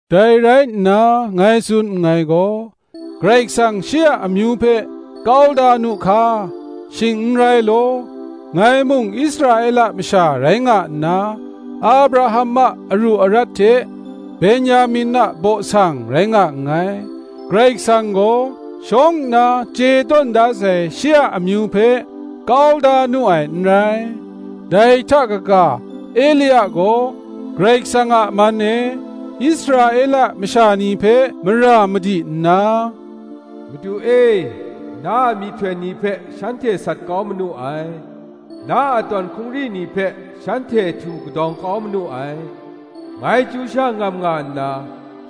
Dai rai nna, ngai tsun nngai gaw, Karai Kasang shi a amyu hpe kau da nu hka? Shing n rai law. Ngai mung Israela masha rai nga nna, Abraham a aru arat hte Ben-yamin a baw sang rai nga nngai. Karai Kasang gaw shawng nna chye tawn da sai, shi a amyu hpe kau da nu ai n rai. Dai hta kaga, Elia gaw Karai Kasang a man e Israela masha ni hpe mara madi nna, Madu e, na a myihtoi ni hpe shanhte sat kau manu ai; na a tawn hkungri ni hpe shanhte htu kadawng kau manu ai; ngai chyu sha ngam nga nna,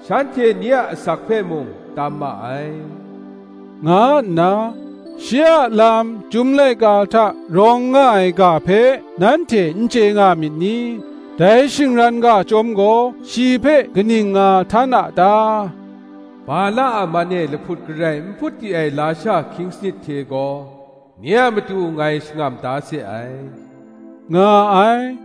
shanhte nye a asak hpe mung tam ma ai, nga nna, shi a lam Chyum laika hta rawng nga ai ga hpe nanhte n chye nga myit ni? Dai shingran ga chyawm gaw shi hpe kaning nga htan a ta? Bala a man e lahput garai n hput di ai lasha hkying sanit hte gaw, nye a matu ngai shangam da se ai, nga ai.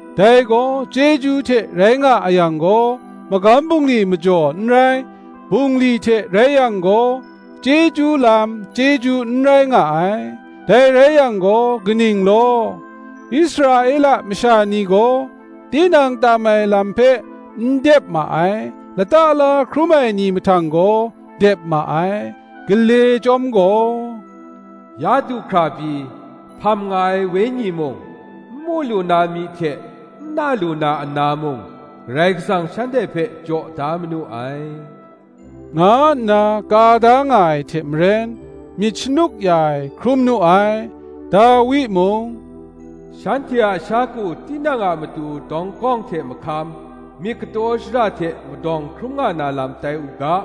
Dai gaw chyeju hte rai nga a yang gaw, magam bungli majaw n rai; bungli hte rai yang gaw, chyeju lam chyeju n rai nga ai. Dai rai yang gaw, kaning law? Israela masha ni gaw, tinang tam ai lam hpe n dep ma ai; lata la hkrum ai ni mahtang gaw dep ma ai: gale chyawm gaw, Ya du hkra pyi, hpam nga ai wenyi mung, n mu lu na myi hte n na lu na ana mung, Karai Kasang shanhte hpe jaw da manu ai, nga nna ka da nga ai hte maren, myit shanuk ya ai hkrum nu ai. Dawi mung, “Shanhte a sha ku tinang a matu dawnggawng hte mahkam, Myit kataw shara hte madawng hkrum na lam tai u ga;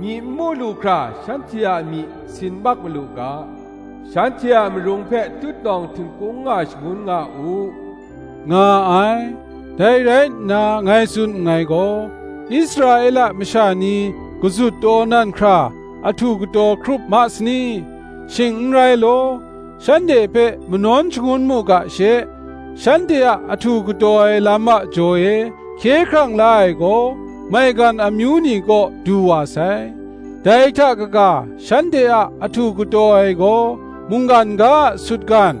Myi n mu lu hkra shanhte a myi sin mak malu ga, Shanhte a marung hpe tutnawng htingkung nga shangun nga u,” nga ai. Dai rai nna ngai tsun nngai gaw, Israela masha ni kazut taw nan hkra ahtu kataw hkrup ma sani? Shing n rai law, Shanhte hpe manawn shangun mu ga she, shanhte a ahtu kataw ai lam a jaw e, hkye hkrang la ai gaw maigan amyu ni kaw du wa sai. Dai hta kaga shanhte a ahtu kataw ai gaw mungkan ga a sutgan,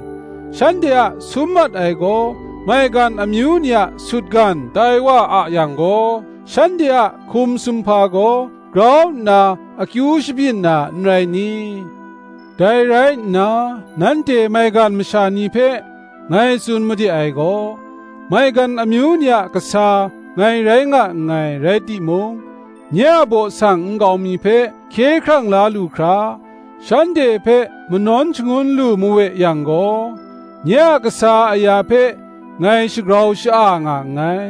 shanhte a sum mat ai gaw maigan amyu ni a sutgan tai wa a yang gaw, shanhte a hkum sumhpa gaw grau nna, akyu shabyin na n rai ni? Dai rai nna nanhte maigan masha ni hpe ngai tsun made ai gaw: maigan amyu ni a kasa ngai rai nga nngai rai timung, nye a baw sang nkau mi hpe hkye hkrang la lu hkra, shanhte hpe manawn shangun lu mawe yang gaw, nye a kasa aya hpe ngai shagrau sha-a nga nngai.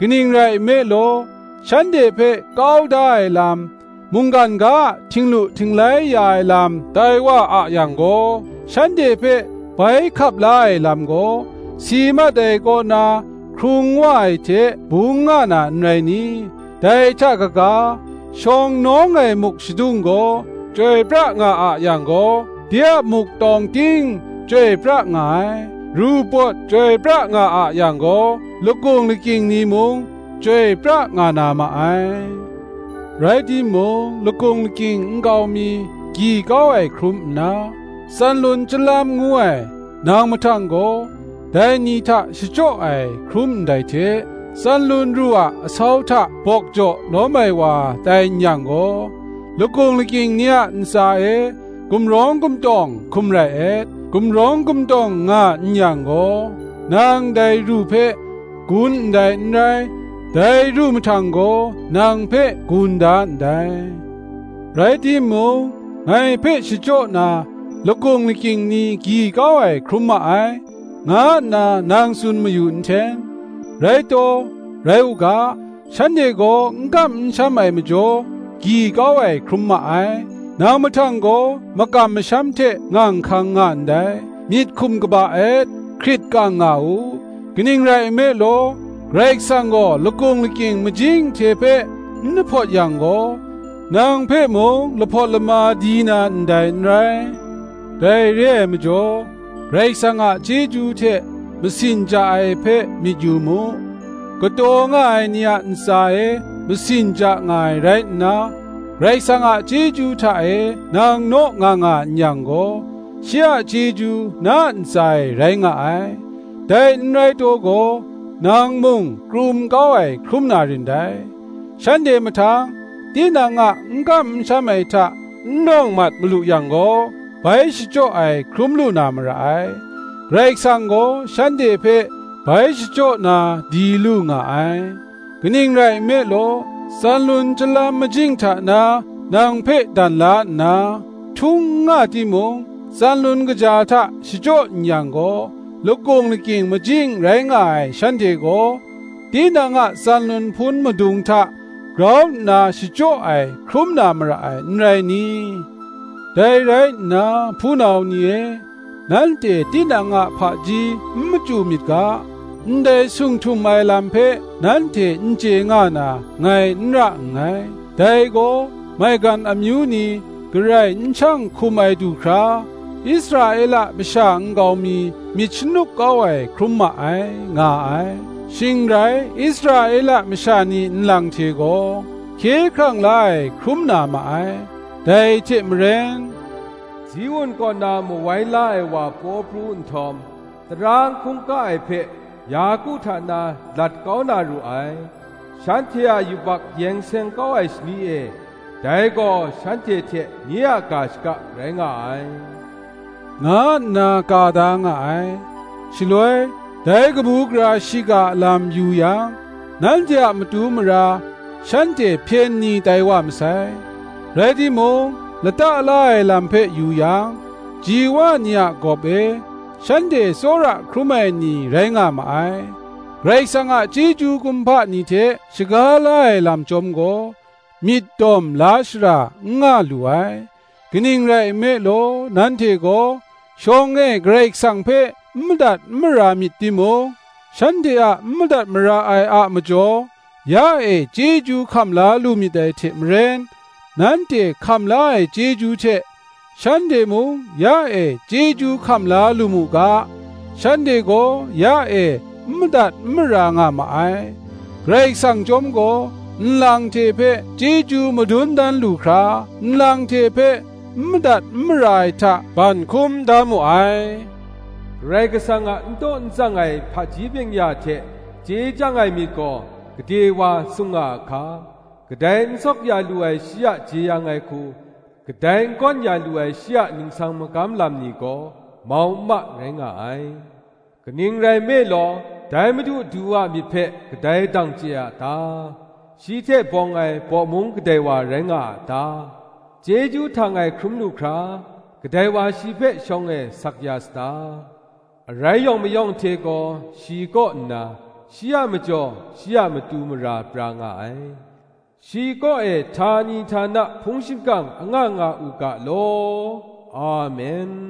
Kaning rai nme law, shanhte hpe kau da ai lam, mungdan ga a htinglu htinglai ya ai lam tai wa a yang gaw, shanhte hpe bai hkap la ai lam gaw, si mat ai kaw na hkrung wa ai hte bung nga na n rai ni? Dai hta kaga, shawng nawng ai muk shadung gaw chyoi pra nga a yang gaw, de a muk tawng ting chyoi pra nga ai; ru pawt chyoi pra nga a yang gaw, lakung lakying ni mung chyoi pra nga na ma ai. Rai timung, lakung lakying nkau mi gyi kau ai hkrum nna, tsanlun chyalam ngu ai nang mahtang gaw, dai ni hta shachyaw ai hkrum ndai hte, tsanlun ru a asau hta bawk jaw lawm ai wa tai n yang gaw, lakung lakying ni a ntsa e gumrawng gumtawng hkum rai et. Gumrawng gumtawng nga n yang gaw, nang dai ru hpe gun ndai n rai, dai ru mahtang gaw nang hpe gun da ndai. Rai timung, Ngai hpe shachyaw na, lakung lakying ni gyi kau ai hkrum ma ai, nga nna nang tsun mayu nhten. Rai taw, rai u ga; shanhte gaw n kam n sham ai majaw gyi kau ai hkrum ma ai, nang mahtang gaw makam masham hte ngang hkang nga ndai. Myit hkum kaba et, hkrit kang nga u: kaning rai nme law, Karai Kasang gaw lakung lakying majing hte hpe n lahpawt yang gaw, nang hpe mung lahpawt lama di na ndai n rai. Dai re ai majaw, Karai Kasang a chyeju hte masin ja ai hpe myit yu mu. Kataw nga ai ni a ntsa e masin ja nga ai rai nna, Karai Kasang a chyeju hta e nang naw nga nga n yang gaw, shi a chyeju na ntsa e rai nga ai, dai n rai taw gaw, nang mung krum kau ai hkrum na rin dai. Shanhte mahtang, tinang a n kam n sham ai hta n nawng mat malu yang gaw, bai shachyaw ai hkrum lu na mara ai: Karai Kasang gaw, shanhte hpe bai shachyaw na di lu nga ai. Kaning rai nme law, tsanlun chyalam majing hta na nang hpe dan la nna, htung n nga timung, tsanlun kaja hta shachyaw n yang gaw, lakung lakying majing rai nga ai shanhte gaw, tinang a tsanlun hpun madung hta grau nna shachyaw ai hkrum na mara ai, n rai ni? Dai rai nna, hpunau ni e, nanhte tinang a hpaji n machyu myit ga, ndai sung htum ai lam hpe nanhte n chye nga na, ngai n ra nngai; dai gaw, maigan amyu ni garai n shang hkum ai du hkra, Israela masha nkau mi myit shanuk kau ai hkrum ma ai, nga ai: shing rai Israela masha ni nlang hte gaw hkye hkrang la ai hkrum na ma ai: dai hte maren, “Ziun kaw na Mawai la ai wa paw pru nhtawm, Tara n hkungga ai hpe Yaku hta na lat kau na ru ai; Shanhte a yubak yeng seng kau ai shani e, Dai gaw shanhte hte nye a ga shaka rai nga ai,” nga nna ka da nga ai. Shaloi, dai kabu gara shiga a lam yu yang, nanhte a matu mara, shanhte hpyen ni tai wa masai; rai timung, lata la ai lam hpe yu yang, ji wa ni a gawp e, shanhte tsawra hkrum ai ni rai nga ma ai. Karai Kasang a chyeju kumhpa ni hte shaga la ai lam chyawm gaw, myit dawm la shara n nga lu ai. Kaning rai nme law, nanhte gaw shawng e Karai Kasang hpe n madat n mara myit timung, shanhte a n madat mara ai a majaw, ya e chyeju hkam la lu myit dai hte maren; nanhte hkam la ai chyeju hte shanhte mung ya e chyeju hkam la lu mu ga, shanhte gaw ya e n madat n mara nga ma ai. Karai Kasang chyawm gaw, nlang hte hpe chyeju madun dan lu hkra, nlang hte hpe n madat n mara ai hta ban hkum da mu ai. Karai Kasang a n taw n tsang ai hpaji byeng-ya hte chye chyang ai myit gaw, gade wa sung nga a hka! kadai n sawk ya lu ai shi a jeyang ai hku, kadai n gawn ya lu ai shi a ningsang magam lam ni gaw, mau n ma rai nga ai. Kaning rai nme law, dai Madu Du a myit hpe kadai dang chye a ta? shi hte bawng ai bawmung kadai wa rai nga a ta? Chyeju htang ai hkrum lu hkra, kadai wa shi hpe shawng e sak ya sata? Arai yawng mayawng hte gaw, shi kaw nna, shi a majaw, shi a matu mara pra nga ai. Shi kaw e htani htana hpung shingkang anga nga u ga law. Amen.